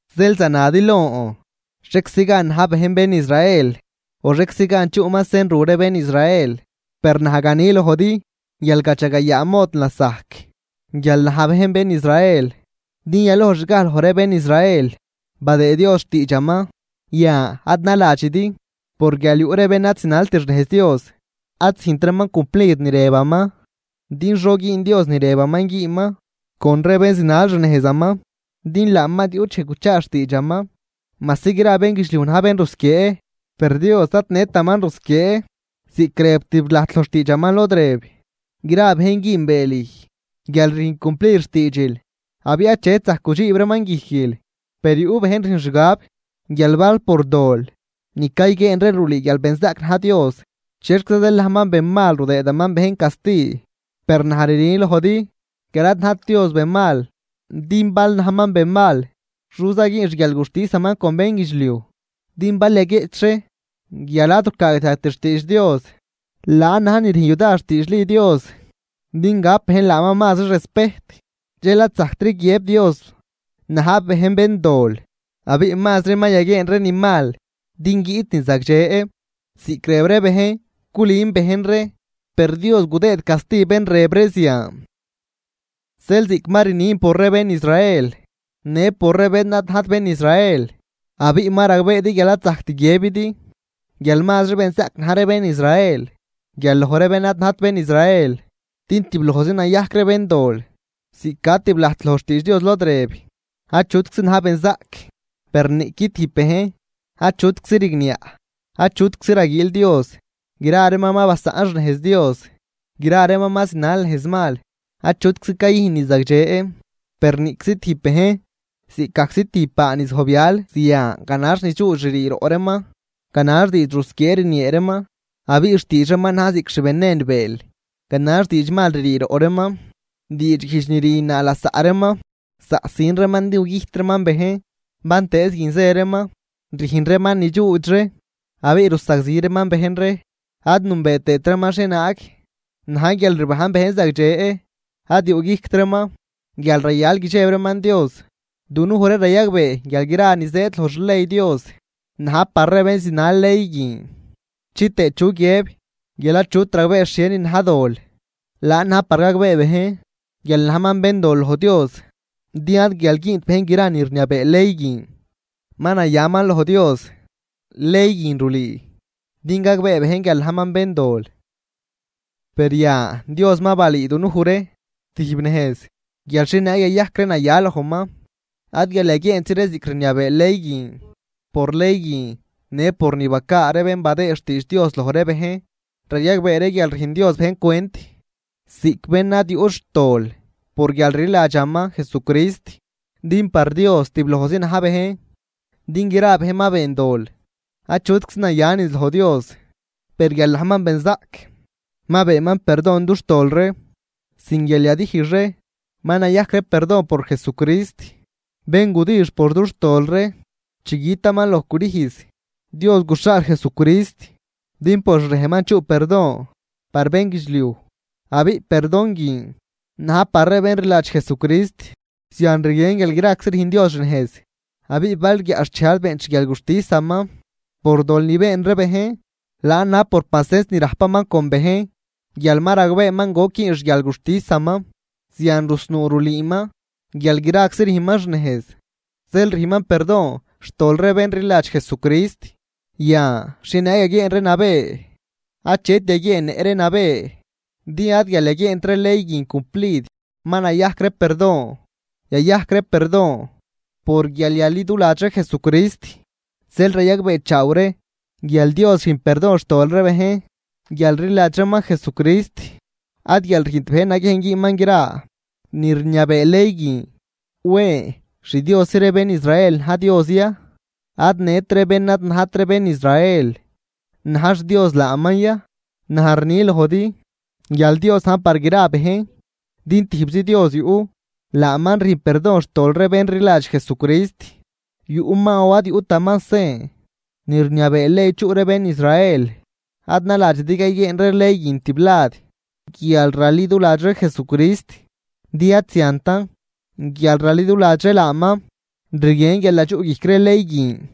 Zeel zanadi lon xhieczi gan na̱j bejn bén Israel o xhieczi gan chuꞌman sen ru ree bén Israel. Per naj gani lojdi guial gadxagayaa mod lasajc guial na̱j bejn bén Israel, din yalojxgaj loj ree bén Israel badëëd Dios xtiidxaman. Yan ad naladxidi por guial yuꞌ ree bén ad zinalt xnejz Dios, ad züjntraman cumplid ni rëbaman din xo güün Dios ni rëbaman güünman con ree bén zinal xnejzaman. Din laaman ad yuꞌt dxej guchaa xtiidxaman, majsi gra bénguidxliuj na̱j bén rusquiee, per Dios ad nëtaman rusquiee, ziꞌc rëb tiblajt loj xtiidxaman lod rëb: Gra bejn güünbee lüj guial rüjn cumplid xtiidxil, abiꞌ achet zajc gudxiib reeman guijquil. (Per yuꞌ bejn rüjn xgab) guial bal por dol ni cayguieen ree rulüü guial benzaꞌc na̱j Dios, ¿chexquiza zeel najman benmal rudëëdaman bejn casti? Per naj rni lojdi guial ad najt Dios benmal, din bal najman benmal xoza güün xguialguxtisaman con bénguidxliuj. Din bal yaguieꞌch ree guial ad rucaagdiajgt xtiidx Dios, laan na̱j ni rüjn yudar xtiidxli Dios din gap bejn laaman mazri respejt, dxel ad zajctri guiëb Dios na̱j bejn béndol. Abiꞌ mazri ma yaguieen ree ni mal din guiꞌt ni zagdxe, ziꞌc rëb ree bejn culün bejn ree, per Dios gudëëd casti bén rëb ree zian. Zeel ziꞌc ma rnin por ree bén Israel, në por ree bén ad najt bén Israel, abiꞌ ma ragbeedi guial ad zajct guiëbidi guial mazri benzaꞌc na̱j ree bén Israel guial loj ree bén ad najt bén Israel, din tiblojzi nayajc ree béndol. Ziꞌc ca tiblajt loj xtiidx Dios lod rëb: Achutczi na̱j benzaꞌc, per niꞌqui tijb bejn. Achutczi rigniaꞌ. Achutczi raguiil Dios. Gra reeman ma basaꞌn xnejz Dios. Gra reeman ma zinal nejz mal. Achutczi cayüjn ni zagdxe, per niꞌczi tijb bejn. Ziꞌcgajczi tijb baa ni zojbyal, zian ganax ni dxuudx ririi roꞌ reeman. Ganax diidx rusquiee rniee reeman. Abiꞌ xtiidx reeman na̱j ziꞌc xvenen bëël. Ganax diidx mal ririi roꞌ reeman, diidxguijdx ni rüjnnaa lasaꞌ reeman. Zaꞌsin reeman din gugüjt reeman bejn. Bantëëz guin zë reeman, rüjn reeman ni dxuudx ree. Abiꞌ rusagzi reeman bejn ree. Ad nünbee tëët reeman xhienaag na̱j guialrbajn bejn zagdxe. Ad yuꞌguijct reeman guial rayal guidxeb reeman Dios. Dunuj ree rayagbee guial gra ni zëëd loj xley Dios, na̱j par ree bén zinal ley guin, chitëë chu guiëb guial achut ragbee xhienin na̱j dol, laan na̱j par gagbee bejn guial najman béndol loj Dios. Din ad guial güünt bejn gra ni rniabee ley guin ma nayaman loj Dios, ley guin rulüü din gagbee bejn guial najman béndol. Per yan Dios ma balüü dunuj ree tijb nejz guial xhienaag yayajc ree naya lojman. Ad guial yaguieentzi ree ziꞌc rniabee ley guin, por ley guin në por ni bacaa ree bén badëë xtiidx Dios loj ree bejn. Rayagbee ree guial rüjn Dios bejn cwent ziꞌc bén ad yuꞌt xtol por guialrliladxaman Jesucrist, din par Dios tiblojzi na̱j bejn. Din gra bejn ma been dol, achutczi naya niz loj Dios. Per guial najman benzaꞌc, ma beenman perdon dux tol ree sin guial yadijx ree, ma nayajc ree perdon por Jesucrist, bén gudix por dux tol ree chi gütaman loj crüjz. Dios guxhaal Jesucrist, din por xrejnman chuꞌ perdon par bénguidxliuj. Abiꞌ perdon guin na̱j par ree bén rliladx Jesucrist. Zian rguien guial graczi rüjn Dios xnejz, abiꞌ bal guiaꞌxchej ad beent xguialguxtisaman por dol ni been ree bejn, laan na̱j por pacens ni rajpaman con bejn, guial ma ragbeeman goc güün xguialguxtisaman. Zian rusnuu rulüüman guial graczi rüjnman xnejz, zeel rüjnman perdon xtol ree bén rliladx Jesucrist. Yan, ¿xhienaag yaguieen ree nabë? Achet yaguieennëꞌ ree nabë, din ad guial yaguieent ree ley guin cumplid ma nayajc ree perdon, yayajc ree perdon por guial yaliduladx ree Jesucrist. Zeel rayagbeechaaw ree guial Dios rüjn perdon xtol ree bejn guial rliladx reeman Jesucrist, ad guial rüjnt bejn naguiejn güünman gra ni rniabee ley guin. ¿Wen xDiosi ree bén Israel na̱j Dios ya, ad nët ree bén ad najt bén Israel na̱j xDios laaman ya? Naj rni lojdi guial Dios na̱j par gra bejn, din tijbzi Dios yuꞌ, laaman rüjn perdon xtol ree bén rliladx Jesucrist, yuꞌman o ad yuꞌtaman sen ni rniabee ley chuꞌ ree bén Israel. Ad naladxidi cayguieen ree ley guin tiblad guial raliduladx ree Jesucrist, din ad ziantan, guial raliduladx ree laaman rguien guial nadxuꞌguijc ree ley guin.